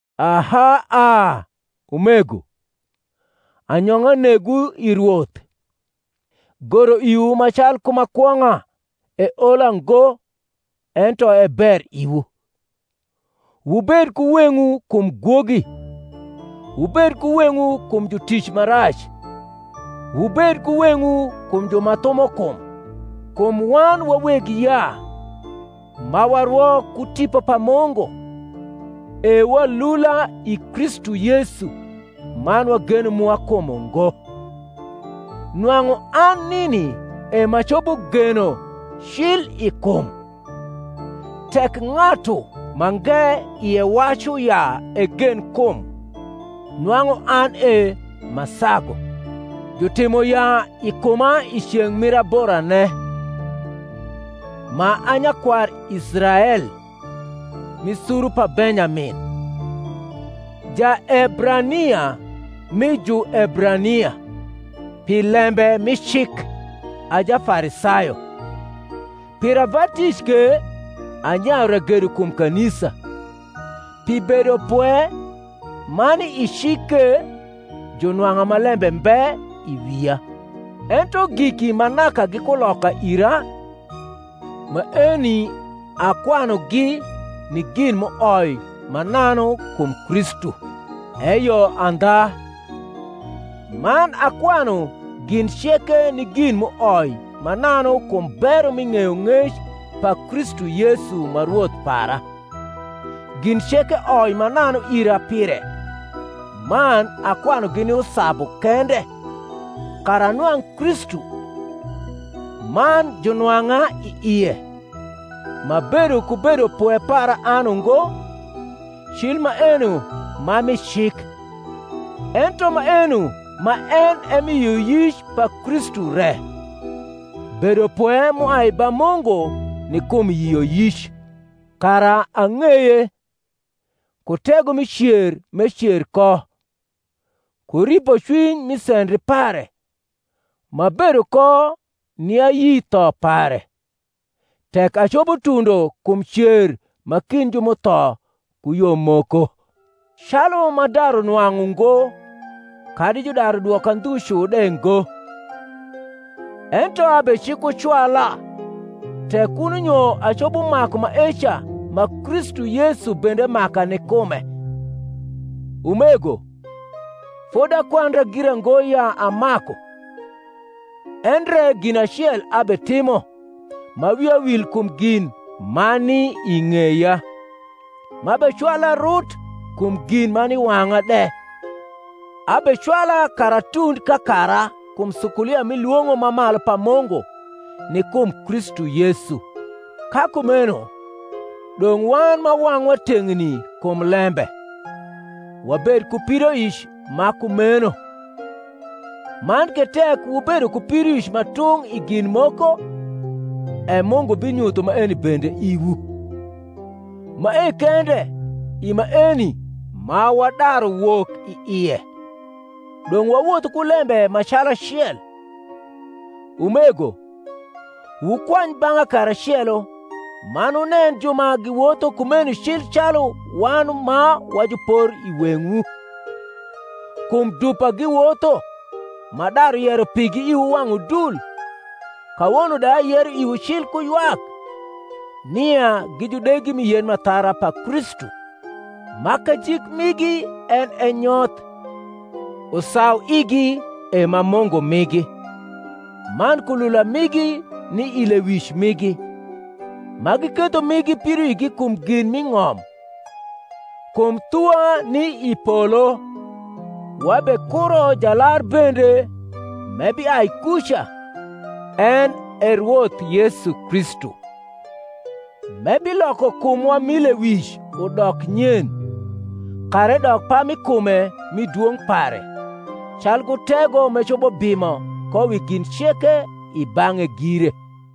Aha a, umego, anyong’a negwu i Rwoth. Goro iwu ma calku ma kwong’a, eola ngo, ento e ber iwu. Wubed ku weng’wu kum gwogi, wubed ku weng’wu kum jutic ma rac, wubed ku weng’wu kum ju ma thumo kum: kum wan wa weg yaa, ma warwo ku Tipo pa Mungu, e walula i Kristu Yesu, man wageno mwa kum ungo: nwang’u an nini e m’acopo geno cli i kum: tek ng’atu mange ie wacu ya egen kum, nwang’u an e m’asagu: jutimo yaa i kuma i ceng’ mir aborane, ma a nyakwar Israel, mi suru pa Benyamin, Jaebrania mi Juebrania; pi lembe mi cik, a Jafarisayo; pir ava tic ke, anyayu ragedo kum kanisa; pi bedopwe ma ni i cik ke, junwang’a ma lembe mbe i wia. Ento giki ma naka gi kuloka ira, maeni akwanugi ni gin m’uoi mananu kum Kristu. Eyo andha, man akwanu gin ceke ni gin m’uoi mananu kum bero mi ng’eyong’ec pa Kristu Yesu ma Rwoth para: gin ceke oi mananu ira pire, man akwanugi ni usabu kende, kara anwang’ Kristu, man junwang’a i ie, m’abedo ku bedopwe para an ungo, cil maeno ma mi cik, ento maeno ma en e mi yioyic pa Kristu re, bedopwe m’uai ba Mungu ni kum yioyic: kara ang’eye, ku tego mi cer m’ecer ko, ku ripocwiny mi sendri pare, m’abedo ko ni ayi tho pare; tek acopo tundo kum cer ma kind ju m’utho ku yo moko. Calu m’adaru nwang’u ngo, kadi judaru dwoka ndhu cu de ngo: ento abecikucwala, tek kuno nyo acopo maku maeca ma Kristu Yesu bende maka ni kume. Umego, fodi akwandra gira ngo ya amaku: endre gin acel abetimo, ma wia wil kum gin ma ni i ng’eya, m’abecwala rut kum gin ma ni i wang’a de, abecwala kara atund kakara kum sukulia mi lwong’o ma malu pa Mungu ni kum Kristu Yesu. Ka kumeno, dong’ wan ma wang’wa teng’ni kum lembe, wabed ku pidoic ma kumeno: man ke tek wubedo ku pidoic ma tung’ i gin moko, e Mungu binyutho maeni bende iwu: mae kende, i maeni ma wadaru wok i ie, dong’ wawothu ku lembe ma calacel. Umego, wukwany bang’a karacelo, man wunen ju ma giwotho kumeni cil calu wan ma wa jupor i weng’wu. Kum dupa giwotho, m’adaru yero pigi iwu wang’ udul, kawono de ayero iwu cil ku ywak, nia gi judegi mi yen m’athara pa Kristu: ma kajik migi en e nyoth, usauigi e ma mungu migi, man kulula migi ni i lewic migi, ma giketho migi pidoigi kum gin m’i ng’om. Kum thuwa ni i polo; wabekuro Jalar bende m’ebiai kuca, en e Rwoth Yesu Kristu: m’ebiloko kumwa mi lewic udok nyen, kara edok pami kume mi dwong’ pare, calku tego m’ecopo bimo ko wi gin ceke i bang’e gire.